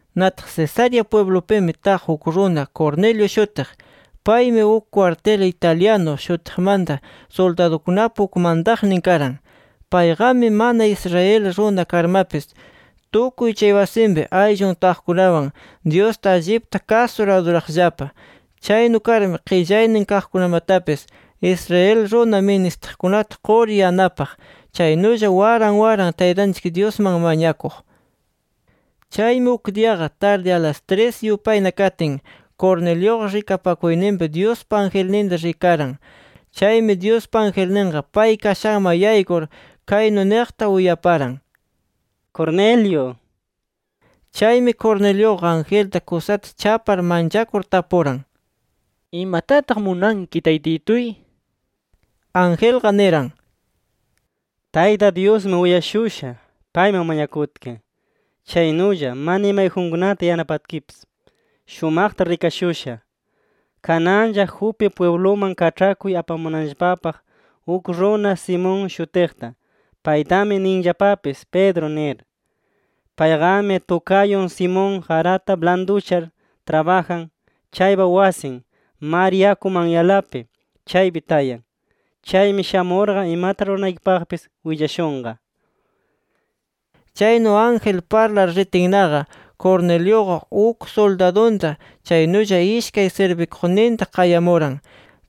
Nataq Cesarea pwiblupimi taq uk runa Cornelio shutiq. Paymi uk kwartil Italiano shutiqmanta suldadukunapa uk mantaqnin karan. Payqami mana Israel runa karmapis tukuy chay wasinpi ayllun taqkunawan Dyusta allipta kasur, aduraqllapa. Chaynu karmi, qillaynin kaqkunamatapis, Israel runa ministiqkunata qur yanapaq. Chaynulla waran waran Taytanchik Dyusman mañakuq. Chaymi uk diyaqa tardi, alas tris yupayna katin, Corneliuqa rikapakuyninpi Dyuspa angelninta rikaran. Chaymi Dyuspa angelninqa pay kashanman yaykur, kaynu niqta uyaparan: “¡Cornelio!” nir. Chaymi, Corneliuqa angelta kusata chapar manchakur, tapuran: “¿Imatataq munanki, Taytituy?” nir. Angelqa niran: “Tayta Dyusmi uyashusha, payman mañakutki. Chaynulla, mana imayjunkunata yanapatkipis, shumaqta rikashusha. Kananlla Jope pwibluman kaĉhakuy apamunanllapapaq uk runa Simón shutiqta. Paytami ninllapapis Pedro nir. Payqami tukayun Simón, qarata blanduchar trabajan chaypa wasin, mar yakupa manyanlapi, chaypi tayan. [Chaymi shamurqa imata ruranaykipaqpis willashunqa]”. Chaynu ángel parlar ritinnaqa, Corneliuqa uk suldadunta, chaynulla ishkay sirbikuqninta qayamuran.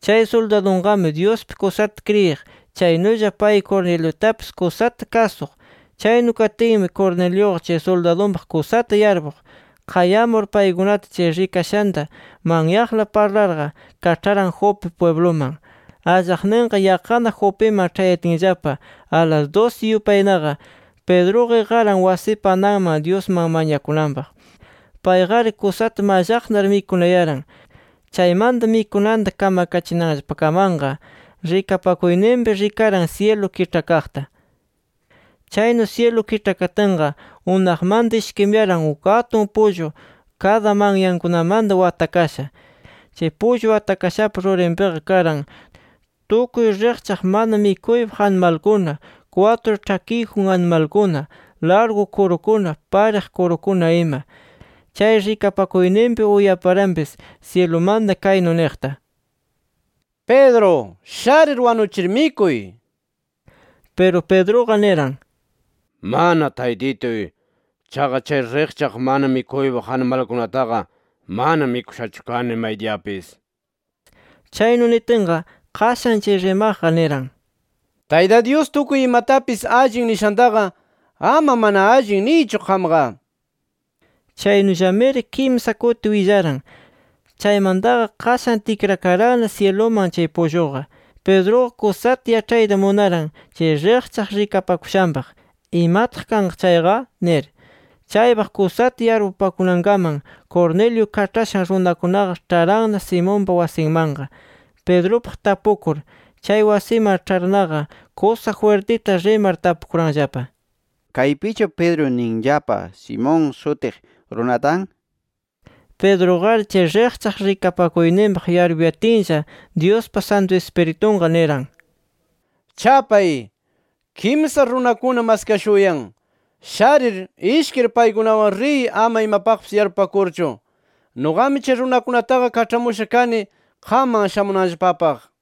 Chay suldadunqami Dyuspi kusata kriyiq. Chaynulla pay Corneliutapis kusata kasuq. Chaynu katinmi Corneliuqa chay suldadunpaq kusata yarpuq. Qayamur paykunata chay rikashanta manyaqla parlarqa, kaĉharan Jope pwibluman. Allaqninqa yaqqana Jopiman ĉhayatinllapa, alas dusi yupaynaqa Pedruqa iqaran wasipa ananman, Dyusman mañakunanpaq. Payqari kusata mallaqnar, mikunayaran. Chaymanta mikunanta kamakachinanllapakamanqa, rikapakuyninpi rikaran syilu kiĉhakaqta. Chaynu syilu kiĉhakatinqa unaqmanta ishkimuyaran uk atun pullu kada manyankunamanta watakasha. Chay pullu watakashapa rurinpiqa karan tukuy riqchaq mana mikuypaq animalkuna, kwatru ĉhakiyjun animalkuna, largu kurukuna, pariq kurukuna ima. Chay rikapakuyninpi uyaparanpis syilumanta kaynu niqta: “Pedro, sharir wanuchir, mikuy” nir. Piru Pedruqa niran: “Mana Taytituy. Chaqa chay riqchaq mana mikuypaq animalkunataqa mana mikushachu kani maydiyapis” nir. Chaynu nitinqa, qashan chay rimaqqa niran: “Tayta Dyus tukuy imatapis ‘Allin’ nishantaqa, ama ‘Mana allin’ niychu qamqa” nir. Chaynullamiri kimsa kuti willaran. Chaymantaqa qashan tikrakaranna syiluman chay pulluqa. Pedruqa kusata yaĉhayta munaran chay riqchaq rikapakushanpaq, ¿imataq kanqa chayqa? nir. Chaypaq kusata yarpupakunankaman, Cornelio kaĉhashan runakunaqa ĉharanna Simonpa wasinmanqa, Pedrupaq tapukur. Chay wasiman ĉharnaqa kusa jwirtita rimar tapukuranllapa: —¿Kaypichu Pedro ninllapa Simón shutiq runa tan? nir. Pedruqari chay riqchaq rikapakuyninpaq yarpuyatinlla, Dyuspa Santu Ispiritunqa niran: “Chapay. Kimsa runakuna maskashuyan. Sharir, ishkir paykunawan riy ama imapaqpis yarpupakurchu. Nuqami chay runakunataqa kaĉhamusha kani qamman shamunanllapapaq” nir.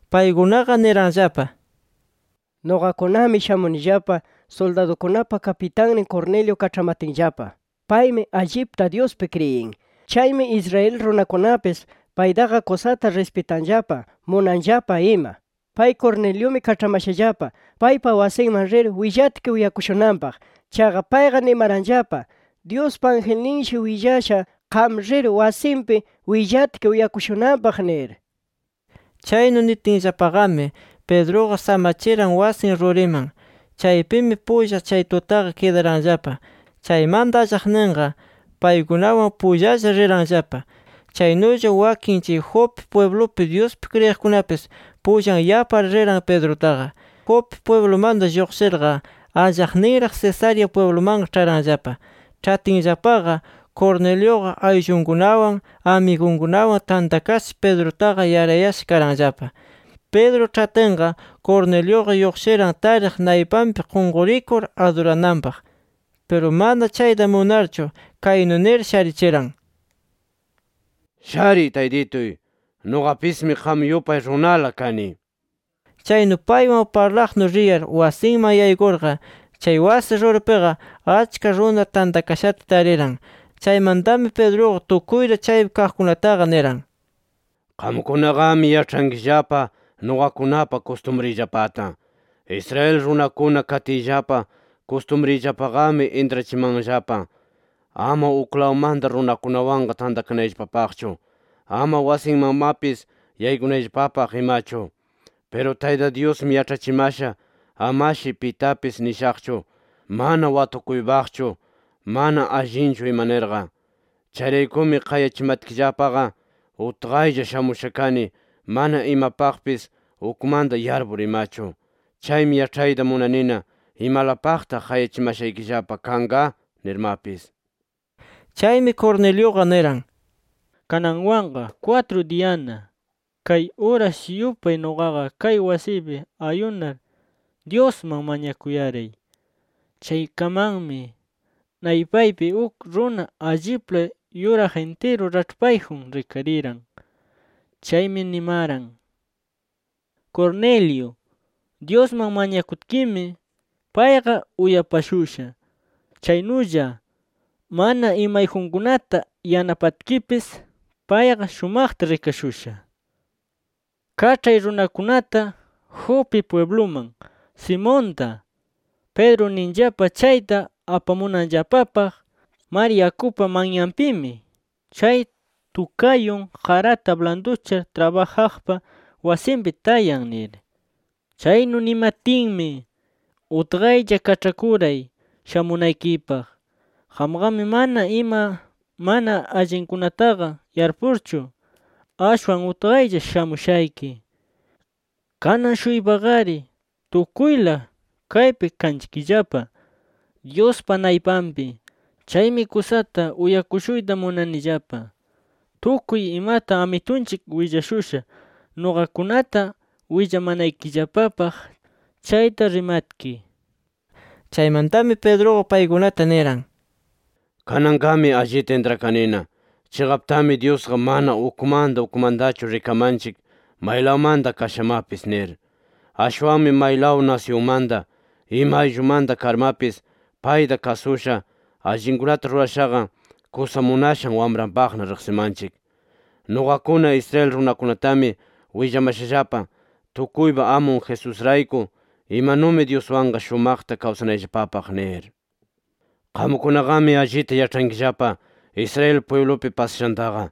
Paykunaqa niranllapa: —Nuqakunami shamunillapa suldadukunapa kapitannin Cornelio kaĉhamatinllapa. Paymi allipta Dyuspi kriyin. Chaymi Israel runakunapis paytaqa kusata rispitanllapa, munanllapa ima. Pay Corneliumi kaĉhamashallapa paypa wasinman rir willatki uyakushunanpaq. Chaqa payqa nimaranllapa Dyuspa angelninshi willasha, qam rir wasinpi willatki uyakushunanpaq nir. Chaynu nitinllapaqami, Pedruqa samachiran wasin ruriman. Chaypimi pullana chay tutaqa kidaranllapa. Chaymanta allaqninqa paykunawan pullalla riranllapa. Chaynulla wakin chay Jope pwiblupi, Dyuspi kriyiqkunapis pullan yapar riran Pedrutaqa. Jope pwiblumanta lluqshirqa, allaqninraq Cesarea pwiblumanqa ĉharanllapa. Ĉhatinllapaqa, Corneliuqa ayllunkunawan amigunkunawan tantakasha, Pedrutaqa yarayasha karanllapa. Pedro ĉhatinqa, Corneliuqa lluqshiran tariq, naypanpi qunqurikur adurananpaq. Piru mana chayta munarchu kaynu nir sharichiran: —Shariy taytituy. Nuqapismi qam yupay runala kani nir. Chaynu paywan parlaqnu riyar wasinman yaykurqa, chay wasi ruripiqa achka runa tantakashata tariran. Chaymantami Pedruqa tukuyta chaypi kaqkunataqa niran: —Qamkunaqami yaĉhankillapa nuqakunapa kustumriyllapata. Israel runakuna katiyllapa kustumriyllapaqami intrachimanllapa: Ama uklawmanta runakunawanqa tantakanayllapapaqchu, ama wasinmanmapis yaykunayllapapaq imachu. Piru Tayta Dyusmi yaĉhachimasha amashi pitapis nishaqchu: ‘Mana watukuypaqchu, mana allinchu ima’ nirqa. Chayraykumi qayachimatkillapaqa, utqaylla shamusha kani, mana imapaqpis ukmanta yarpur imachu. Chaymi yaĉhayta munanina ¿imalapaqtaq qayachimashaykillapa kanqa? nirmapis. Chaymi Corneliuqa niran: —Kananwanqa kwatru diyana, kay uras yupay nuqaqa kay wasiypi ayunar, Dyusman mañakuyaray. Chaykamanmi, naypaypi uk runa allipla yuraq intiru raĉhpayjun rikariran. Chaymi nimaran: ‘Cornelio, Dyusman mañakutkimi, payqa uyapashusha. Chaynulla, mana imayjunkunata yanapatkipis payqa shumaqta rikashusha. Kaĉhay runakunata Jope pwibluman Simonta, Pedro ninllapa chayta apamunanllapapaq. Mar yakupa manyanpimi chay tukayun qarata blanduchar trabajaqpa wasinpi tayan’ nir. “Chaynu nimatinmi, utqaylla kaĉhakuray shamunaykipaq. Qamqami mana ima mana allinkunataqa yarpurchu, ashwan utqaylla shamushayki. Kanan-shuypaqari tukuyla, kaypi kanchikllapa, Dyuspa naypanpi. Chaymi kusata uyakushuyta munanillapa, tukuy imata Amitunchik willashusha nuqakunata willamanaykillapapaq chayta rimatki” nir. Chaymantami Pedruqa paykunata niran: —Kananqami allita intrakanina, chiqaptami Dyusqa mana ukmanta ukmantachu rikamanchik maylawmanta kashamapis nir. Ashwanmi maylaw nasyunmanta, ima ayllumanta karmapis payta kasusha, allinkunata rurashaqa, kusa munashan wamranpaqna riqsimanchik. Nuqakuna Israel runakunatami willamashallapa, tukuypa Amun Jesusrayku, imanumi Dyuswanqa shumaqta kawsanayllapapaq nir. “Qamkunaqami allita yaĉhankillapa Israel pwiblupi pasashantaqa.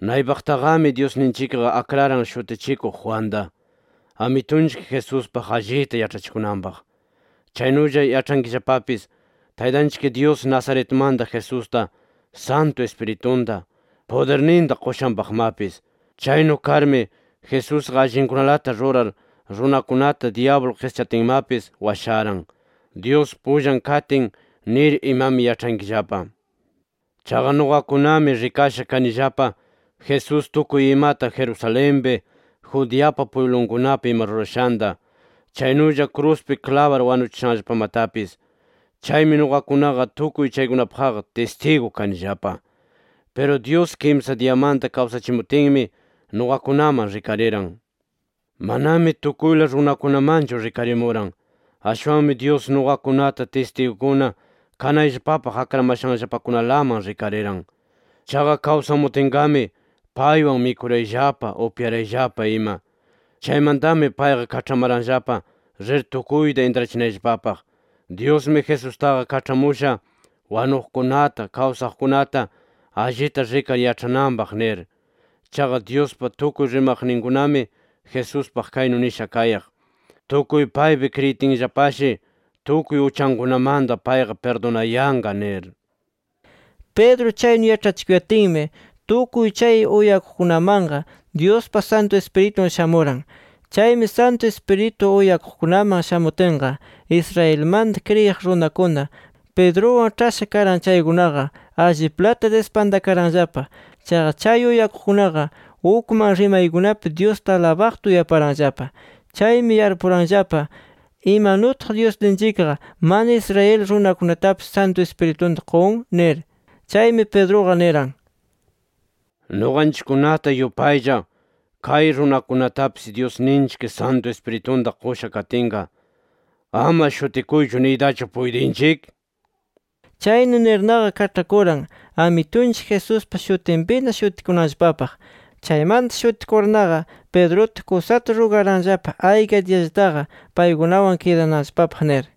Naypaqtaqami Dyusninchikqa akraran Shutichikuq Juanta, Amitunchik Jesuspaq allita yaĉhachikunanpaq. Chaynulla yaĉhankillapapis, Taytanchik Dyus Nazaretmanta Jesusta Santu Ispiritunta, pudirninta qushanpaqmapis. Chaynu karmi Jesusqa allinkunalata rurar, runakunata dyablu qischatinmapis washaran, Dyus pullan katin nir imami yaĉhankillapa. Chaqa nuqakunami rikasha kanillapa Jesús tukuy imata Jerusalenpi, Judeapa pwiblunkunapi ima rurashanta, chaynulla kruspi klabar wanuchishanllapamatapis. Chaymi nuqakunaqa tukuy chaykunapaqqa tistigu kanillapa. Piru Dyus, kimsa diyamanta kawsachimutinmi, nuqakunaman rikariran. Manami tukuyla runakunamanchu rikarimuran. Ashwanmi Dyus nuqakunata tistigukuna kanayllapapaq akramashanllapakunalaman rikariran. Chaqa kawsamutinqami, paywan mikurayllapa, upyarayllapa ima. “Chaymantami payqa kaĉhamaranllapa, rir tukuyta intrachinayllapapaq: ‘Dyusmi, Jesustaqa kaĉhamusha wanuqkunata, kawsaqkunata allita rikar yaĉhananpaq’ nir. Chaqa Dyuspa tukuy rimaqninkunami Jesuspaq kaynu nisha kayaq: ‘Tukuy paypi kriyitinllapashi tukuy uchankunamanta payqa pirdunayanqa’ nir”. Pedro chaynu yaĉhachikuyatinmi, tukuy chay uyakuqkunamanqa Dyuspa Santu Ispiritun shamuran. Chaymi Santu Ispiritu uyakuqkunaman shamutinqa, Israelmanta kriyiq runakuna Pedruwan ĉhasha karan chaykunaqa, alliplata dispantakaranllapa. Chaqa chay uyakuqkunaqa ukman rimaykunapi Dyusta alabaqta uyaparanllapa. Chaymi yarpuranllapa: ¿Imanutaq Dyusninchikqa mana Israel runakunatapis Santu Ispiritunta qun? nir. Chaymi Pedruqa niran: —Nuqanchikkunata yupaylla kay runakunatapis Dyusninchik Santu Ispiritunta qusha katinqa, ¿ama shutikuychu niytachu puytinchik? nir. Chaynu nirnaqa kaĉhakuran Amitunchik Jesuspa shutinpina shutikunanllapapaq. Chaymanta shutikurnaqa, Pedruta kusata rugaranllapa ayka diyallataqa paykunawan kidananllapapaq nir.